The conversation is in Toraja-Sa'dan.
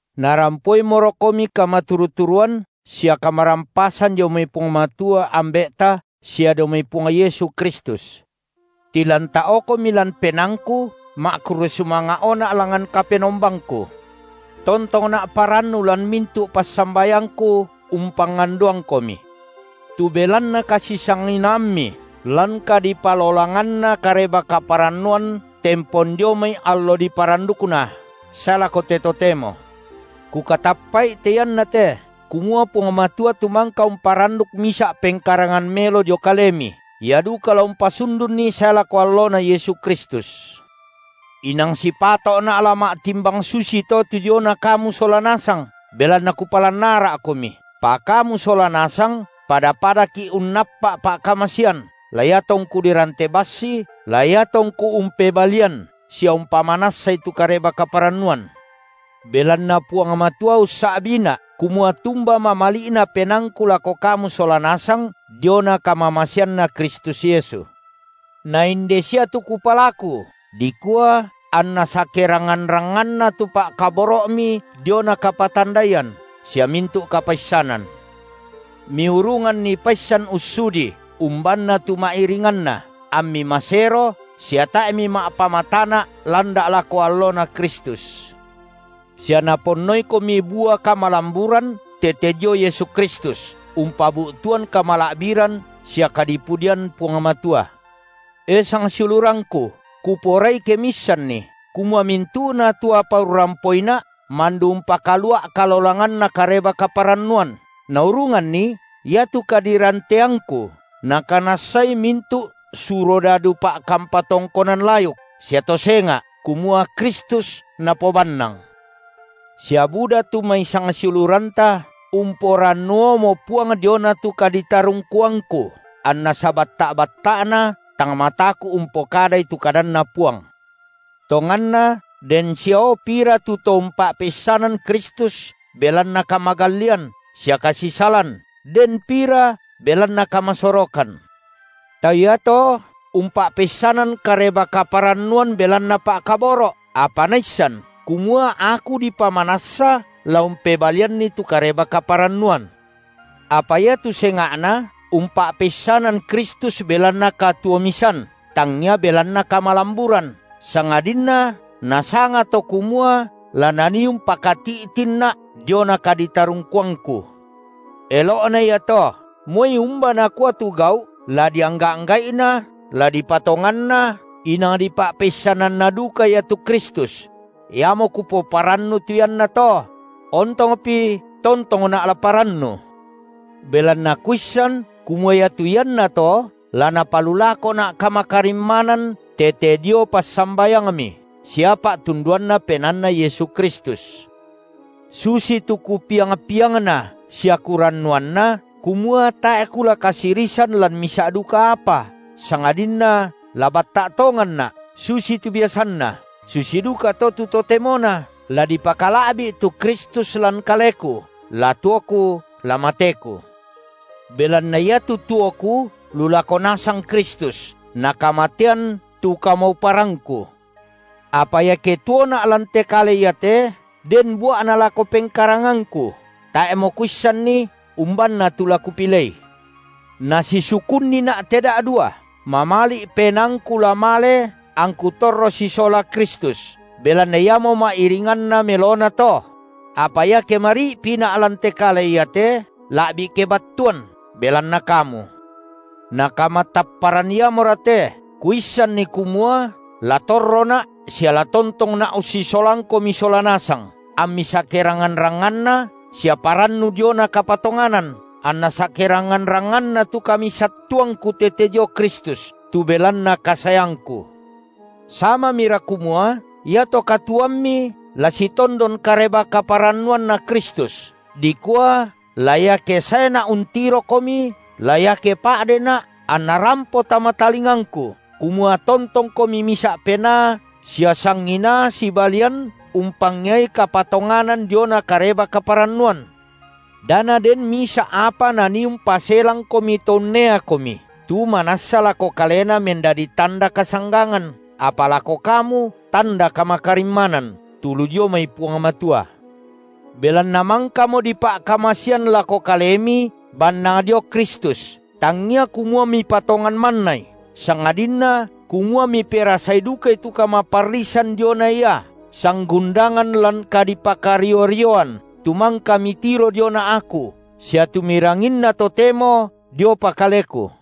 Narampoimorokomi kamaturu-turuan sia kamarampasan dio mai Puang Matua, Ambe’ta sia dio mai Puang Yesu Kristus. Tilanta’okomi lan penaangku ma’kurre sumanga’ona’ langngan Kapenom- bangku. Tontongna’ parannu lan mintu’ passambayangku umpangandoangkomi. Tu belanna kasisanginaammi lan kadipalolanganna Kareba-kaparannuan tempon dio mai allo diparandukna sae lako te totemo. Kukatappa’i te iannate, kumua Puang Matua tu mangka umparanduk misa’ pengkarangan melo dio kalemi, Ia duka la umpasundunni sae lako alloNa Yesu Kristus. Inang sipato’na’ la ma’timbang susito tu diona kamu sola nasang, belanna kupalan ara’komi, pa kamu sola nasang pada-padaki’ unnappa’ pa’kamasean, la iatongku dirante bassi, la iatongku umpebalian sia umpamanassai tu Kareba-kaparannuan. Belanna Puang Matua ussa’biina’ kumua tumba mamali’na penaangku lako kamu sola nasang diona kamamaseanNa Kristus Yesu. Na inde sia tu kupalaku, dikua anna sakerangngan-rangnganna tu pa’kaboro’mi diona kapatandaian sia mintu’ kapaissanan. Miurunganni paissan ussudii umbanna tu ma’iringanna, ammi masero sia tae’ mima’pamatana’ landa’ lako alloNa Kristus. Sia naponnoikomi bua kamalamburan tete dio Yesu Kristus, umpabu’tuan kamala’biran sia kadipudian Puang Matua. E sangsiulurangku, kuporai ke miissanni, kumua mintu’na tu apa urrampoina’ mandu umpakalua’ kalolanganna Kareba-kaparannuan, naurunganni iatu kadiranteangku nakanassai mintu’ surodadu pa’kampa tongkonan layuk sia to senga’, kumua Kristus napobannang. Sia buda tu mai sangsiuluranta umporannuomo Puang diona tu kaditarungkuangku, anna sabatta’-batta’na tang mataku’ umpokadai tu kadanNa Puang. Tonganna den siao pira tu to umpa’peissanan Kristus belanna kamagallian sia kasisalan, den pira belanna kamasorokan. Tau iato umpa’peissanan Kareba-kaparannuan belanna pa’kaboro’, apa naissan kumua aku dipamanassa la umpebalianni tu Kareba-kaparannuan; apa iatu senga’na umpa’peissanan Kristus belanna katuo-misan, tangia belanna kamalamburan, sangadinna nasanga, to kumua la nanii umpakati’tinna’ diona kaditarungkuangku. Elo’na iato. Moi umba nakua tu gau’, la diangga’-angga’ina, la dipatonganna, inang dipa’peissananna duka ia tu Kristus; iamo kupoparannu tu iannato; ontongpi tontongna’ la parannu. Belanna kuissan, kumua iatu iannato la napalulakona’ kamakarimmanan tete di passambayangmi sia pa’tunduanNa PenaanNa Yesu Kristus, susitu kupiang-piangna sia kurannuanna, kumua tae’ kula kasirisan lan misa’ duka apa, sangadinna la batta’ tonganna’, susitu biasanna, susi dukato tu totemona, la dipakala’bi’ tu Kristus lan kaleku, la tuoku la mateku. Belanna iatu tuoku lu lako nasang Kristus, na kamatean tu kamauparangku. Apa iake tuona’ lan te kale iate, den bua’na lako pengkarangangku, tae’mo kuissanni, umbanna tu la kupilei; nasisukunnina’ te da’dua: mamali’ penaangku la male angku torro sisola Kristus, belanna iamo ma’iringanna melona to; apa iake mari’pina’ lan te kale iate, la’bi kebattuan belanna kamu. Na kamatapparan iamora te, kuissanni kumua la torrona’ sia la tontongna’ ussisolangkomi sola nasang, ammi sakerangngan-rangnganna sia parannu diona kapatonganan, anna sakerangngan-rangnganna tu kamisattuanangku tete dio Kristus, tu belanna kasaeangku. Samamira kumua iato katuoammi la sitondon Kareba-kaparannuanNa Kristus, dikua la iake saena’ untirokomi, la iake pa’dena’, anna rampo tama talingangku, kumua tontongkomi misa’ penaa sia sanginaa sibalian umpangeai kapatonganan diona Kareba-kaparannuan. Da naden misa’ apa nanii umpaselangkomi to unneakomi, tu manassa lako kalena mendadi tanda kasanggangan, apa lako kamu tanda kamakarimmanan, tu lu dio mai Puang Matua. Belanna mangkamo dipa’kamasean lako kalemi bannang dio Kristus, tangia kumua mipatongan mannai, sangadinna kumua miperasai dukai tu kamaparrisan diona Ia, sanggundangan lan kadipakario-rioan tu mangka mitiro diona aku sia tu miranginna totemo diopa kaleku.